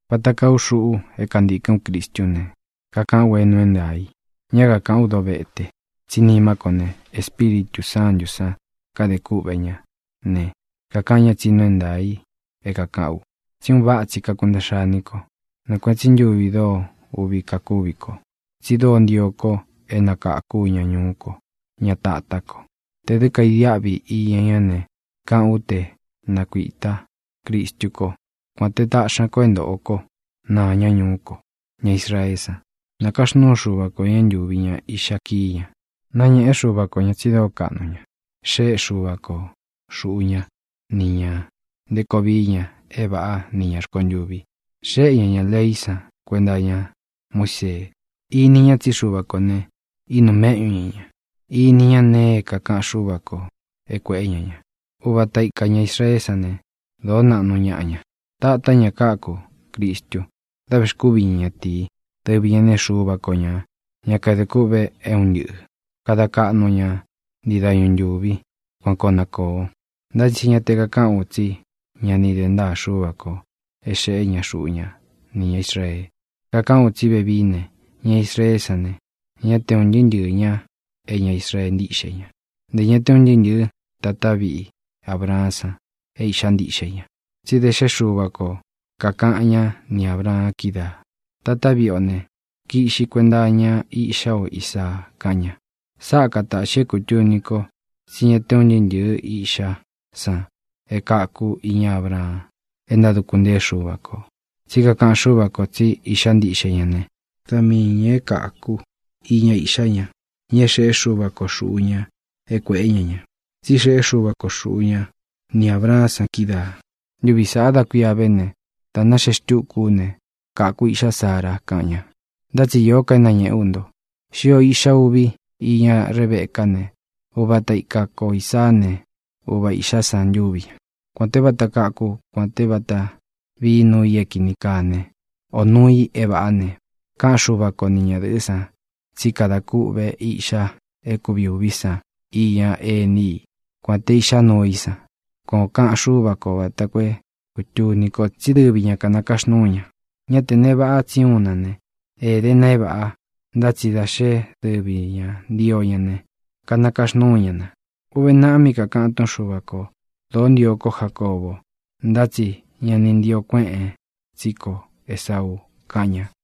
Vata kaa u xuꞌu é kantīkɨ́n u Cristú ne, kakaꞌán u é nuu é ntaā i, ñá kakaꞌán u dovete, tsí nimá ko ne, Espíritū Sántū san kade kúꞌvē ñá ne, kakaꞌan ñá tsi nuu é ntaā i é kākaꞌán u tsí un váꞌa tsi kakuntaꞌxa iní ko. Nɨɨ kuēꞌen tsí ntuvi dóo uꞌvi kakúvi ko, tsi dóo ntio ko é nakākú ña ñuú ko, ña tatá ko. Tē dɨ́ kaidiaꞌvi iña ñá ne, kaꞌán u te nakuītá Cristú ko, kuān te taꞌxi ñá ko é ntōꞌo kó naa ña ñuú ko, ña Israeé san. Nakaxnúu Xuva ko ñā é ntūvi ña iꞌxa kiín ña. Nañēꞌe Xúva ko ñā tsi dóo kaꞌnu ña. Xéꞌe Xuva ko xūꞌu ña ni ña nté koo vií ña é vāꞌá ni ñā rkontuvi. Xéꞌe ña ñā leí san kuenta iña Muísee. Ini ña tsí Xuva kō ne, ínūu méꞌñu ña ñā. Ini ña nee é kākaꞌan Xúva kō é kuēꞌé ña ña. Uva ata ika ñā Israeé san ne, dōó naꞌnu ñaꞌa ña. Tatá ña káku Cristu da vexkúvi ña ñatīi. Dɨvi ñā né, Xuva ko ñā, ñá kadē kûꞌve é un ntɨꞌɨ̄. Kada kaꞌnu o ña ntii dañu ntūvi. Kuan koo na kōo. Ntá tsi ña te kakaꞌán u tsí ña ni de ntáa Xúva kō é xeꞌé ña xuꞌu ña nī ña Israee. Kakaꞌán u tsí vevií ne, ña Israeé san ne, ñá te un ntɨɨ́ ntɨɨ̄ ña é ña Israee ntíꞌxe ña. Ntē ña te un ntɨɨ́ ntɨ̄ɨ́ tatá viꞌi Abraán san é īꞌxá ntiꞌxe ña. Tsí da xé Xuva ko kākaꞌan ñá ni Ābraan kídaā: “Tatá viꞌi o ne, kiꞌxi kuenta iña iꞌxá o Isaa”, kaꞌan ña. Sáꞌa katāꞌxi é kūtuni ko tsí ña te un ntɨɨ́ ntɨ̄ɨ́ iꞌxá san e káku iña Abraan é ntáduku ntée Xuva kō. Tsí kakaꞌan Xúva kō tsí iꞌxá ntiꞌxe ña ne, da miī ña é kāku iña iꞌxá ña, ña é xeꞌé Xuva ko xūꞌu ña é kuēꞌé ña ña. Tsí xeꞌé Xuva ko xūꞌu ña ni Abraán san kídaā: “Ntuvi sāꞌa da kuía ve ne, dā náxee xtúku ú ne, kaku iꞌxá Sara”, kaꞌan ña. Ntá tsi īó ka é nañēꞌe ú nto. Xío īꞌxa uvi íña Rebecá ne, uvata ika ko Īsaá ne, uva īꞌxá san ntúvi ña. Kuān té vata káku, kuān té vata vií nuu i é kīni kaa ne, o nuū i é vāꞌá ne, káꞌan Xuva ko ni ñadɨ̄ꞌɨ́ san tsí kada kûꞌvé iꞌxa é kuvi ūví san iña ení i, kuān té iꞌxa nuu í san. Kuan ō kaꞌan Xúva kō vata koo é kūtuni ko tsi dɨ́vi ñā kanakaxnúu ña. Ñá te nee vaꞌa tsi úun na ne, éde na é vāꞌa, ntá tsi da xé dɨvi ñā ntío ña ne, kanakaxnúu ña na. Uve naꞌa mí kakāꞌan túꞌun Xuva kō: “Dōó ntio kó Jacóbo, ntá tsi ña ni ntio kuéꞌēn tsí ko Esauu”, kaꞌan ña.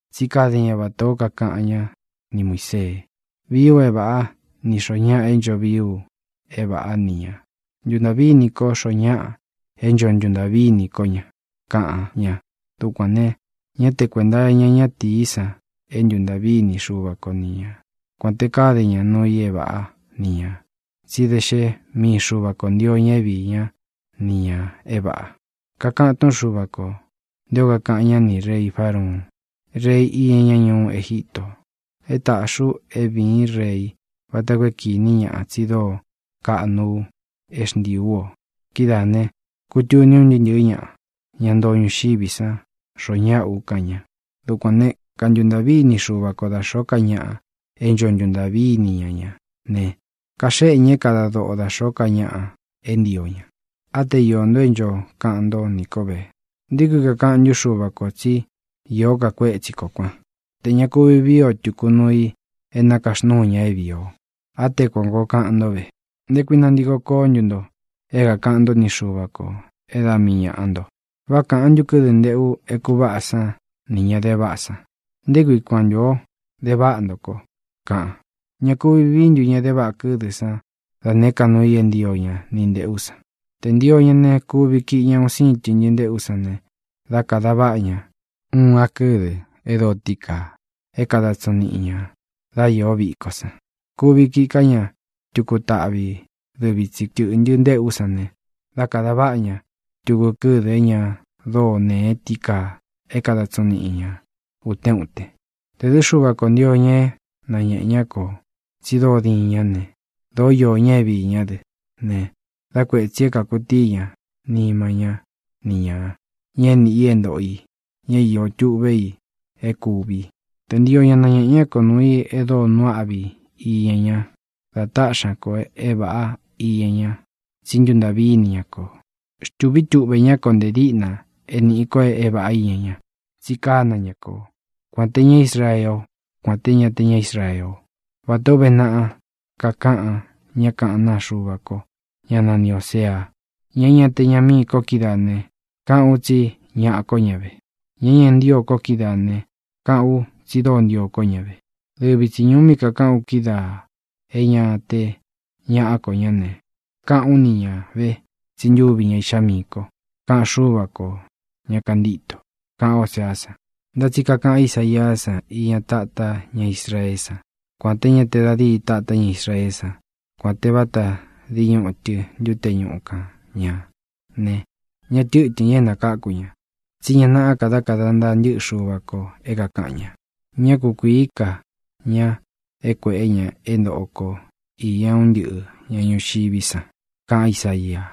Tsí kade ña vatā ó kakaꞌan ñá ni Muīsee: “Vii u é vāꞌá nī xoo ñáꞌa é ncho vií u é vāꞌá ni ñā. Ntuntaꞌví ini kó xoo ñáꞌa é ncho ntuntaꞌví ini kó ña”, kaꞌan ña. Dukuān ne, ñá te kuēnta iña ñátīí san é ntuntaꞌví ini Xuva ko ni ña, kuān te káde ña nuu i é vāꞌá ni ñā, tsí da xé mii Xuva kō ntio ña é viī ñá ni ñā é vāꞌa. Kakaꞌan túꞌun Xuva kō nté ō kakaꞌan ñá nī rei Fárauun, rei iña ñá ñuú Egito: “É tāꞌxi u é vīín rei vata koo é kīní ñaꞌa tsi dóo kaꞌnu u é xntiī ú o. Kidáā ne, kutuní uun ntɨɨ́ ntɨ̄ɨ́ ñaꞌa, ña ntoo ñuxiví san, xoo ñáꞌa u”, kaꞌan ña. Dukuān né, kantuntaꞌví ini Xuva ko da xōó ka ñaꞌa é ncho ntuntaꞌví ini ña ña ne, kaxéꞌe ña é kada doꞌo da xōó ka ñaꞌa é ntio ña. Á te iō nto é ncho kaꞌan ntó nī kó ve: “¿Nté kui kakaꞌan ntú Xuva kō tsí īó ka kuétsi kō kuan, te ña kuvi víi o tūku nuu i é nakaxnuu ña é vīi o?” Á te kuān koo kaꞌan ntó ve. ¿Nté kui nantiko koó ntu nto é kākaꞌan ntó ni Xuva kō é da mii ñāꞌa nto? ¿Vá kāꞌan ntu kɨ́dɨ nteꞌu é kūváꞌa san nī ña de váꞌa san: “¿Nté kui kuan ntu ō de váꞌa nto ko?”, kaꞌan? ¿Ña kuvi vií ntu ña de váꞌa kɨ́dɨ san da nēé ka nuu i é ntio ña ni ntēꞌú san? Tē ntio ña ne, kuvi kiꞌi ña un síin tɨꞌntɨ nteꞌú san ne, dá kadā váꞌa ña uun a kɨ́dɨ e dóo tií kaa é kada tsiñu niꞌi ñā dá iō víko san. Kuvi kiꞌi ká ña tuku taꞌvi dɨvi tsi tɨ̄ꞌntɨ ntéꞌú san ne, dá kāda váꞌa ña tuku kɨ́dɨ é ña dóo nēe tií kaa é kada tsiñu niꞌi ña ūtén uten. Tē dɨ́ Xuva kō ntio ña é nañēꞌe ñá kō tsi dóo diin ñá ne, dōó iō ña é viī ñá dɨ ne, dá kuētsi é kākutií ña nima ñá ni ñāꞌa, ña é nīꞌi é ntōꞌo i, ña é iō tuꞌve i é kūvi. Tē ntio ñá nañēꞌe ñá ko nuu i e dóo nuu áꞌvi iña ña dá taꞌxi ña kō é vāꞌá iña ña tsí ntuntaꞌví ini ña ko. Xtūvi tuꞌve ñá kō nte díꞌna é nīꞌi ko é vāꞌá iña ña. Tsi kána ña ko, kuān te ñá Israeé o, kuān te ña é ña te ña Israee o. Vatā ó uve naꞌa kakaꞌan ñá kaꞌán naa Xuva ko, ñá nani Ōsea: Ña é ña te ñaꞌa mií ko kídaā ne, káꞌān u tsí ñaꞌa kó ña ve. Ña é ña ni ntío ko kídaā ne, káꞌān u tsi dóo ntio kó ña ve. Dɨvi tsi ñūu mí kakaꞌán u kídaā é ña te ñaꞌá ko ñá ne, káꞌān ú ni ñā ve tsí ntuvi ña iꞌxá miī kó, kaꞌan Xúva kō, ña kantíto, kaꞌan Óseá san. Ntá tsi kakaꞌan Ísaiá san iña tátá ña Israeé san: “Kuān té ña te da díi tāta ña Israeé san, kuān té vata dii ñutɨ ntute ñúꞌu kan ñā ne, ñá tɨtɨ̄n ña é nakáku ña. Tsí ña nāꞌá ka dá kāda ntaa ntɨ́ꞌɨ Xuva kō é kākaꞌan ña. Ñá kukuīí ka ña é kuēꞌé ña é ntoꞌo ko īña un ntɨ́ꞌɨ ñā ñuxiví san”, kaꞌan Ísaia.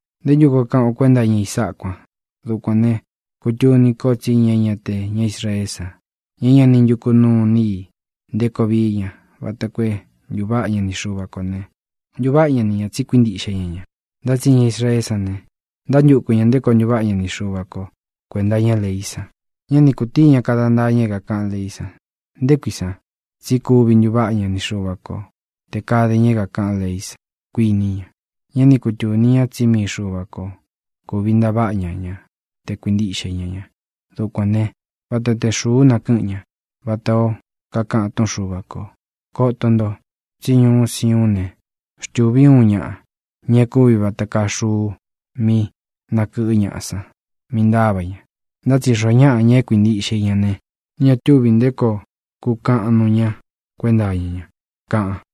¿Nté ntu koo kaꞌan o kuénta iña i sáꞌā kuan? Dukuān ne, kutuni ko tsí ña é ña te ña Israeé san, ña é ña ni ntúku nuu ini i nté koo vií ña vata koo é ntūváꞌa ña ni Xuva kō ne, ntuváꞌa ña ni ñā tsi kuíntiꞌxe ña ña. Ntá tsi ña Israeé san ne, ntánantuku ñā nté koo ntuváꞌa ña ni Xuva ko kuēnta iña leí san ne, ña ni kutíi ña kada ntaa ña é kākaꞌán leí san. ¿Nté kui san? Tsí kuvi ntuváꞌa ña ni Xuva ko tē kade ña é kākaꞌán leí san, kuiní ña. Ñá ni kutūni ña tsí mii Xuva ko kūvi ntaváꞌa ña ña te kuīntiꞌxe ñá ña. Dukuān né, vata te xūú nakɨꞌɨ́ ña, vatā ó kakaꞌan túꞌun Xuva kō: Koto nto, tsí ñuú Siuún ne, xtūví u uun ñaꞌa, ña é kūvi vata kaa xuu mí nākɨꞌɨ́ ñaꞌa san, mí ntāva ña. Ntá tsi xoo ñáꞌa, ña é kuīntiꞌxe i ña ne, ña túvī nté koo kukaꞌan nuu ña kuénta iña ña, kaꞌan.